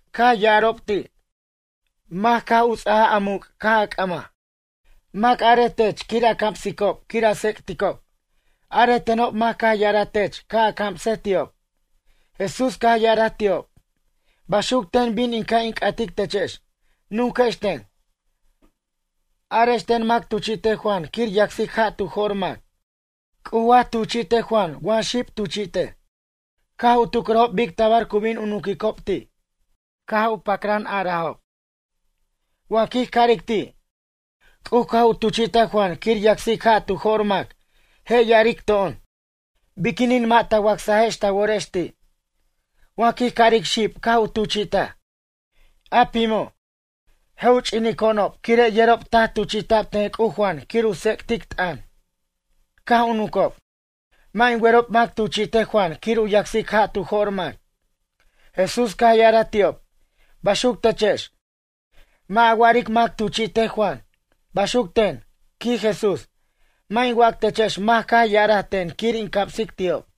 Caj ya'arob ti': ―Mac caj u ts'ajaj a muc' caj a c'ʌmaj? Mac arej tech quir a camsicob quir a tsec'ticob? Arej tenob mac caj u ya'araj tech ca' a camsej ti'ob? Jesús caj ya'araj ti'ob: ―Baxuc ten bin in ca' in c'atic techex. Nunquex ten. Arex ten mac tuchi'tej Juan quir yacsic ja' tu jo'r mac? C'uj wa tuchi'tej Juan wa xib tuchi'tej? Caj u tucrajob bic tabar cu bin u nunquicob ti'. Caj pacran arajob: ―Wa quij aric ti', C'uj caj u tuchi'taj Juan quir u yacsic ja' tu jo'r mac, je' ya'aric to'on: “Biquinin mʌ' ta wacsajex ta worex ti'?” Wa quij aric xib caj u tuchi'taj, a pimo', je' u ch'inico'onob quire' yerob taj tuchi'ta'b ten C'uj Juan quir u tsec'tic t'ʌn. Caj u nuncob: ―Mʌ' in werob mac tuchi'tej Juan quir u yacsic ja' tu jo'r mac. Jesús caj ya'araj ti'ob: ―Baxuc techex, mʌ' a wa'aric mac tuchi'tej Juan, baxuc ten ―quij Jesús―, mʌ' in wac techex mac caj u ya'araj ten quir in camsic ti'ob.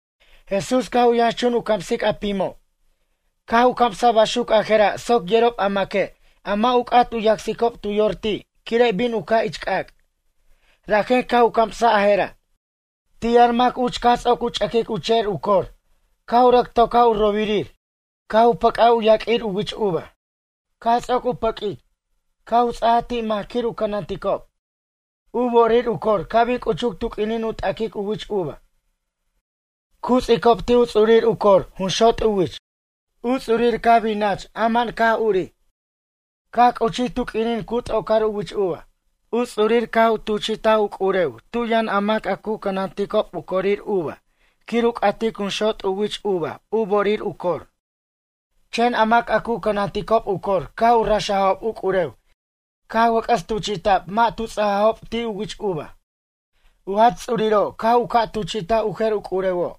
Jesús caj u yʌnxchun u camsic a pimob caj u camsaj baxuc a je'ra' soc yerob a maque' a mʌ' u c'at u yacsicob tu yor ti' quire' bin u ca' ich c'ac'. Rajen caj u camsaj a je'ra': ―Ti' yʌn mac uch caj ts'oc u ch'ʌquic u che'er u cor caj u rʌc tocaj u robirir caj u pʌc'aj u yaq'uir u wich uva. Caj ts'oc u pʌq'uic, caj u ts'aj ti' mac quir u cʌnanticob. U bo'orir u cor ca' bin c'uchuc tu q'uinin u t'aquic u wich uva. Cu ts'icob ti' u ts'urir u cor jun xot' u wich. U ts'urir caj bin nach ama'an caj urij. Caj c'uchij tu q'uinin cu t'ocar u wich uva. U ts'urir caj u tuchi'taj u c'urew tu yʌn a mac a cu cʌnanticob u corir uva quir u c'at junxot' u wich uva u bo'orir u cor. Chen a mac a cu cʌnanticob u cor caj u raxajob u c'urew caj wʌc'ʌs tuchi'ta'b mʌ' tu ts'ajajob ti' u wich uva. U jach ts'uriro' caj u ca' tuchi'taj u jer u c'urewo'.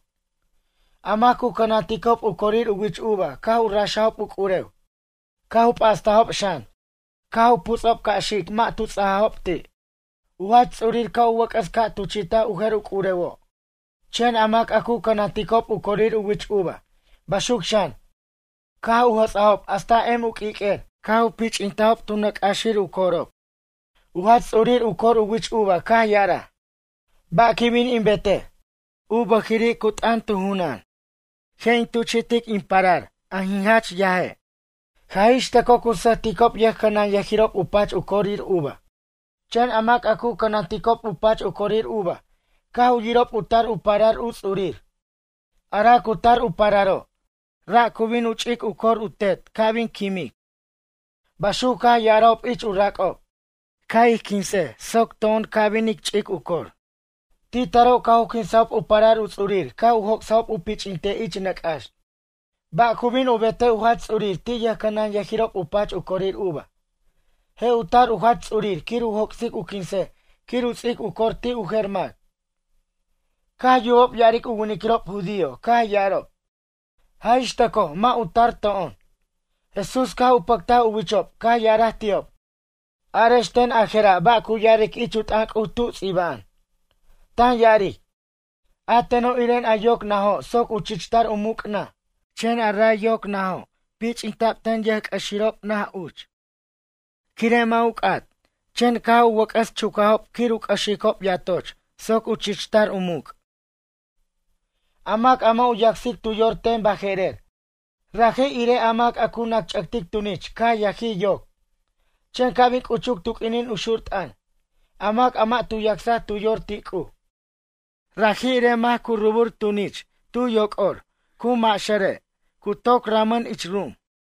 A mac cu cʌnanticob u corir u wich uva caj u raxob u c'urew. Caj u p'astajob xan caj u puts'ob ca' xic mʌ' tu ts'ajajob ti'. U jach ts'urir ca' u wʌc'ʌs ca' tuchi'taj u jer u c'urewo' chen a mac a cu cʌnanticob u corir u wich uva, baxuc xan, caj u jʌts'ajob hasta em u q'uiq'uer caj u pich'intajob tu nʌc' c'axir u corob. ’U jach ts'urir u cor u wich uva caj ya'araj: “Ba' quin bin in betej?” U bʌjir cu t'ʌn tu junan: “Je' in tuchi'tic in parar in jach yaj, jaj ixtʌcoj cu sʌjticob yʌjcʌnʌnyʌjirob u pach u corir uva.” Chen a mac a cu cʌnanticob u pach u cor uva caj u yirob u tar u parar u ts'urir: “Ara' cu tar u pararo', ra' cu bin u ch'ic u cor u tet ca' bin quimqui'.” Baxuc caj ya'arob ich u rac'ob: “Ca' ij quinsej soc to'on ca' bin ic ch'ic u cor.” Ti' taro' caj u quinsajob u parar u ts'urir caj u joc'sajob u pich'intej ich nʌc' c'ax. Ba' cu bin u betej u jach ts'urir ti' yʌjcʌnanyʌjirob u pach u corir uva? Je' u tar u jach ts'urir quir u joc'sic u quinsej quir u ts'ic u cor ti' u jer mac. Caj yubob ya'aric u winiquirob judío caj ya'arob: ―Jaj ixtʌcoj mʌ' u tar to'on. Jesús caj u pʌctaj u wichob caj ya'araj ti'ob: ―Arex ten ajera' ba' cu ya'aric ich u t'ʌn C'uj tu ts'iba'an? Tan ya'aric: A teno' iren a yoc najo' soc u chich tar u muc' naj, chen a ray yoc najo' pich'ita'b ten yʌjc'ʌxirob naj uch. Quire' mʌ' u c'at, chen caj u wʌc'ʌs chucajob quir u c'ʌxicob yatoch soc u chichtar u muc'. A mac a mʌ' u yacsic tu yor ten baje'rer. Raji' irej a mac cu nacch'ʌtic tunich caj yajij yoc. Chen ca' bin c'uchuc tu q'uinin u xur t'ʌn, a mac a mʌ' tu yacsaj tu yor ti' C'uj, raji' irej mac cu rubur tunichir tu yoc'or cu maxʌre' toc ramʌn ich ru'um.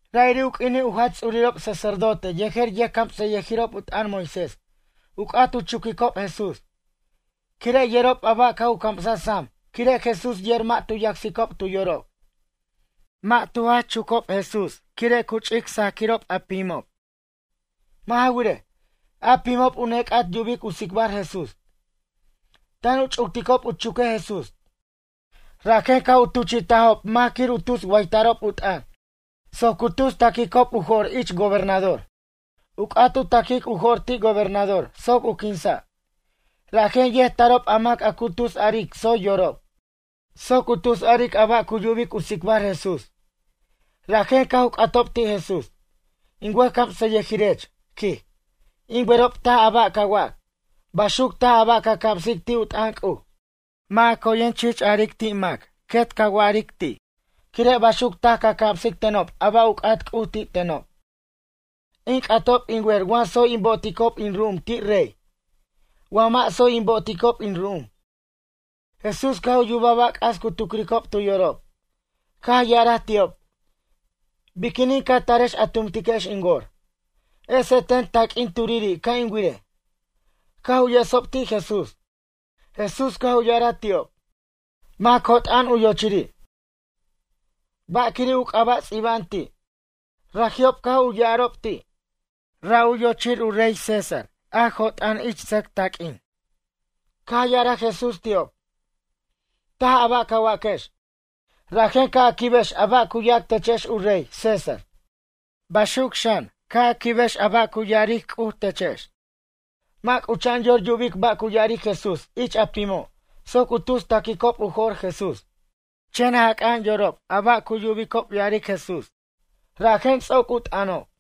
Ra'iri' u q'uinin u jach ts'urirob sacerdote yejer yʌjcamsʌyʌjirob u t'ʌn Moisés u c'at u chuquicob Jesús. Quire' yerob a ba' caj u camsaj sam quire' Jesús yer mʌ' tu yacsicob tu yorob. Mʌ' tu jach chucob Jesús quire' cu ch'ic saquirob a pimob. Mʌ' ja wirej, a pimob u nec'at yubic u tsicbar Jesús. Tan u ch'ucticob u chuquej Jesús, rajen caj u tuchi'tajob mac quir u tus waytarob u t'ʌn soc cu tus ta'quicob u jo'r ich gobernador. U c'at u ta'quic u jo'r ti' gobernador soc u quinsa'. Rajen yet tarob a mac a cu tus aric tsoy yorob. Soc u tus aric a ba' cu yubic u tsicbar Jesús. Rajen caj u c'atob ti' Jesús: ―In wʌjcamsʌyʌjirech ―quij―, in werob taj a ba' ca wac. Baxuc taj a ba' ca camsic ti' u t'ʌn C'uj. Mʌ' a coyen chich aric ti' mac quet ca wa'aric ti'. Quire' baxuc taj ca camsic tenob a ba' u c'at C'uj ti' tenob. In c'atob in wer wa tsoy in bo'oticob in ru'um ti' rey? Wa mʌ' tsoy in bo'oticob in ru'um? Jesús caj u yubaj ba' c'as cu tucricob tu yorob, caj ya'araj ti'ob: ―Biquinin ca tarex a tumtiquex in wor? Esej ten a taq'uin turiri' ca' in wirej. Caj u yesob ti' Jesús. Jesús caj u ya'araj ti'ob: ―Mac jot'a'an u yochiri'? Ba' quiri' u c'aba' ts'iba'an ti'? Raji'ob caj u ya'arob ti': ―Ra' u yochir u rey César, jot'a'an ich sʌc taq'uin. Caj ya'araj Jesús ti'ob: ―Taj a ba' ca waquex. Rajen ca' a quibʌquex a ba' cu yac techex u rey, César, baxuc xan, ca' a quibʌquex a ba' cu ya'aric C'uj techex. Mʌ' c'ucha'an yor yubic ba' cu ya'aric Jesús ich a pimo' soc u tus ta'quicob u jo'r Jesús. Chen jaca'an yorob a ba' yubicob ya'aric Jesús. Rajen ts'oc u t'ʌnob.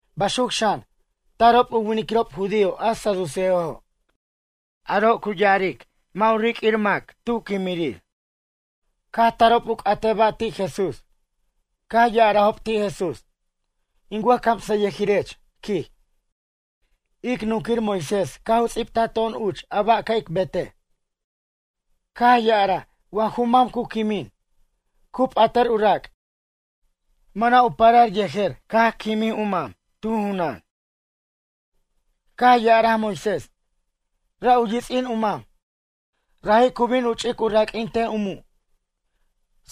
Baxuc xan, tarob u winiquirob judío a saduceojo'. Aro' cu ya'aric mʌ' u riq'uir mac tu quimirir. Caj tarob u c'atej ba' ti' Jesús; caj ya'arajob ti' Jesús: ―In wʌjcamsʌyʌjirech ―quij―, ic nunquir Moisés caj u ts'ibtaj to'on uch a ba' ca' ic betej. Caj ya'araj wa ju mam cu quimin, cu p'atʌr u rac', mʌna' u parar yejer caj quimin u mam, tu junan. Caj ya'araj Moisés, ra' u yits'in u mam, raji' cu bin u ch'ic u raq'uintej a mu'.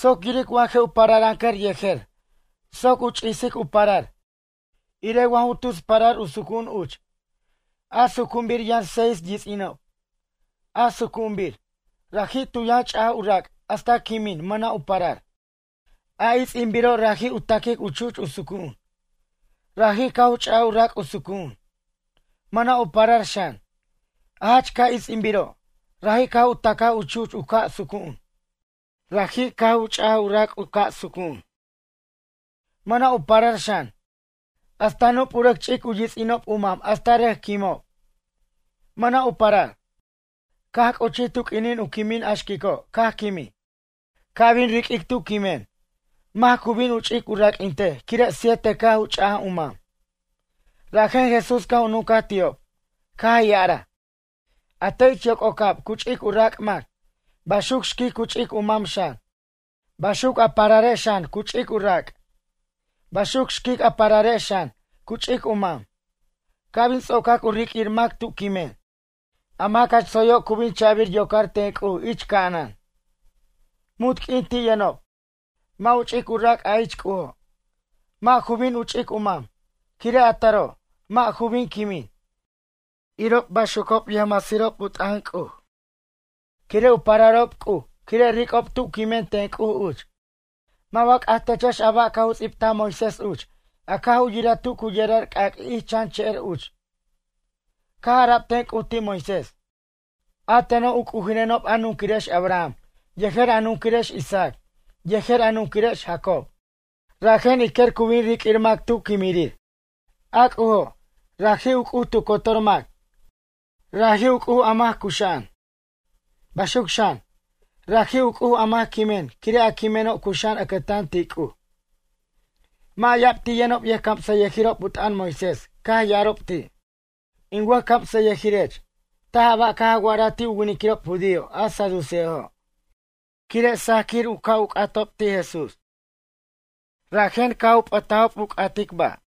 Soc yiric wa je' u pararancʌr yejer soc u ch'isic u parar, irej waj u tus parar u sucu'un uch. A sucu'unbir yʌn seis yits'inob. A sucu'unbir, raji' tu yʌn ch'aj u rac' hasta quimin, mʌna' u parar. A its'inbiro' raji' u ta'quic u chu'ch u sucu'un. Raji' caj u ch'aj u rac' u sucu'un, mʌna' u parar xan. A jach ca' its'inbiro', raji' caj u ta'ca u chu'ch u ca' sucu'un. Raji' caj u ch'aj u rac' u ca' sucu'un. Mʌna' u parar xan. Hasta nup u rʌc ch'ic u yits'inob u mam hasta rʌc quimob, mʌna' u parar. Caj c'uchij tu q'uinin u quimin a xquico' caj quimij. Ca' bin riq'uic tu quimen, mac cu bin u ch'ic u raq'uintej quire' siete caj u ch'aj u mam. Rajen Jesús caj u nuncaj ti'ob, caj ya'araj: ―A te' ich yoc'ocab cu ch'ic u rac' mac, baxuc xquic cu ch'ic u mam xan. Baxuc a pararex xan cu ch'ic u rac', baxuc xquic a pararex xan, cu ch'ic u mam. Ca' bin ts'ocac u riq'uir mac tu quimen, a mac jach tsoyo' cu bin cha'bir yocar ten C'uj ich ca'anan. Munt q'uin ti' yʌnob. Mʌ' u ch'ic u rac' a ich C'ujo'. Mʌ' ju bin u ch'ic u mam. Quire' a taro', mʌ' ju bin quimen, irob baxucob yʌjmasirob u t'ʌn C'uj. Quire' u pararob C'uj quire' ric'ob tu quimen ten C'uj uch. Mʌ' wa c'aj techex a ba' caj u ts'ibtaj Moisés uch a caj u yiraj tu cu yerar c'ac' ich chan che'er uch. Caj ara'b ten C'uj ti' Moisés. “A teno' u C'ujirenob a nunquirex Abraham yejer a nunquirex Isaac yejer a nunquirex Jacob.” Rajen ij quer cu bin riq'uir mac tu quimirir. A C'ujo', raji' u C'uj tu cotor mac. Raji' u C'uj a mac cuxa'an. Baxuc xan, raji' u C'uj a mac quimen quire' a quimeno' cuxa'an ʌcʌtan ti' C'uj. Mʌ' ya'ab ti' yʌnob yʌjcamsʌyʌjirob u t'ʌn Moisés caj ya'arob ti': ―In wʌjcamsʌyʌjirech, taj a ba' caj a wa'araj ti' u winiquirob judío a saduceojo'. Quire' sajaquir u ca' u c'atob ti' Jesús. Rajen caj u p'ʌtajob u c'ata ba'.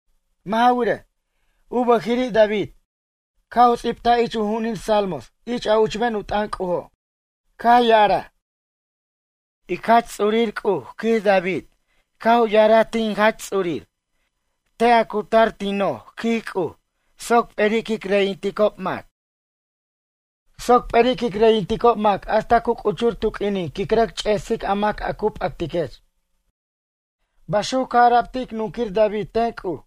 Mʌ' ja wirej, u bʌjiri' David, caj u ts'ibtaj ich u ju'unin Salmos ich a uchben u t'ʌn C'ujo'. Caj ya'araj: Ic Jach Ts'ur C'uj, quij David, caj u ya'araj ti' in Jach Ts'ur: “Tar a cutar, quij C'uj, tin noj soc p'eri' quic reyinticob mac. Soc p'eri' quic reyinticob mac hasta cu c'uchur tu q'uinin quin rʌc ch'ersic a mac a cu p'actiquech.” Baxuc caj ara'b ti' ic nunquir David ten C'uj.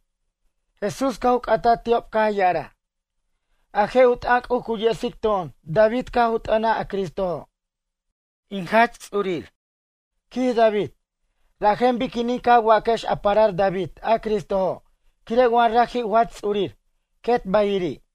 Jesús caj u c'ataj ti'ob caj ya'araj: ―A je' u t'ʌn C'uj cu yesic to'on David caj u t'ʌnaj a Cristojo', in Jach Ts'ur, quij David. Rajen biquinin ca waquex u parar David a Cristojo' quire' wa raji' u Jach Ts'urir, quet ba'iri'?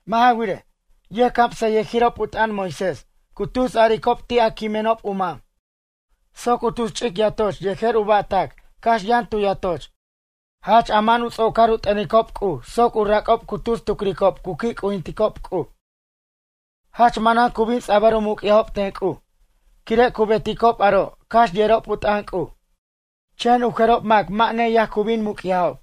Mʌ' ja wirej. yʌjcamsʌyʌjirob u t'ʌn Moisés cu tus aricob ti' a u quimenob u mam. Soc u tus ch'ic yatoch yejer u ba'tac cax yʌn tu yatoch. Jach ama'an u ts'ocar u t'ʌnicob C'uj soc u rac'ob cu tus tucricob cu qui' c'ujinticob C'uj. Jach manan cu bin ts'abʌr u muc'yajob ten C'uj quire' cu beticob aro' cax yerob u t'ʌn C'uj. Chen u jerob mac mʌ' neyaj cu bin muc'yajob.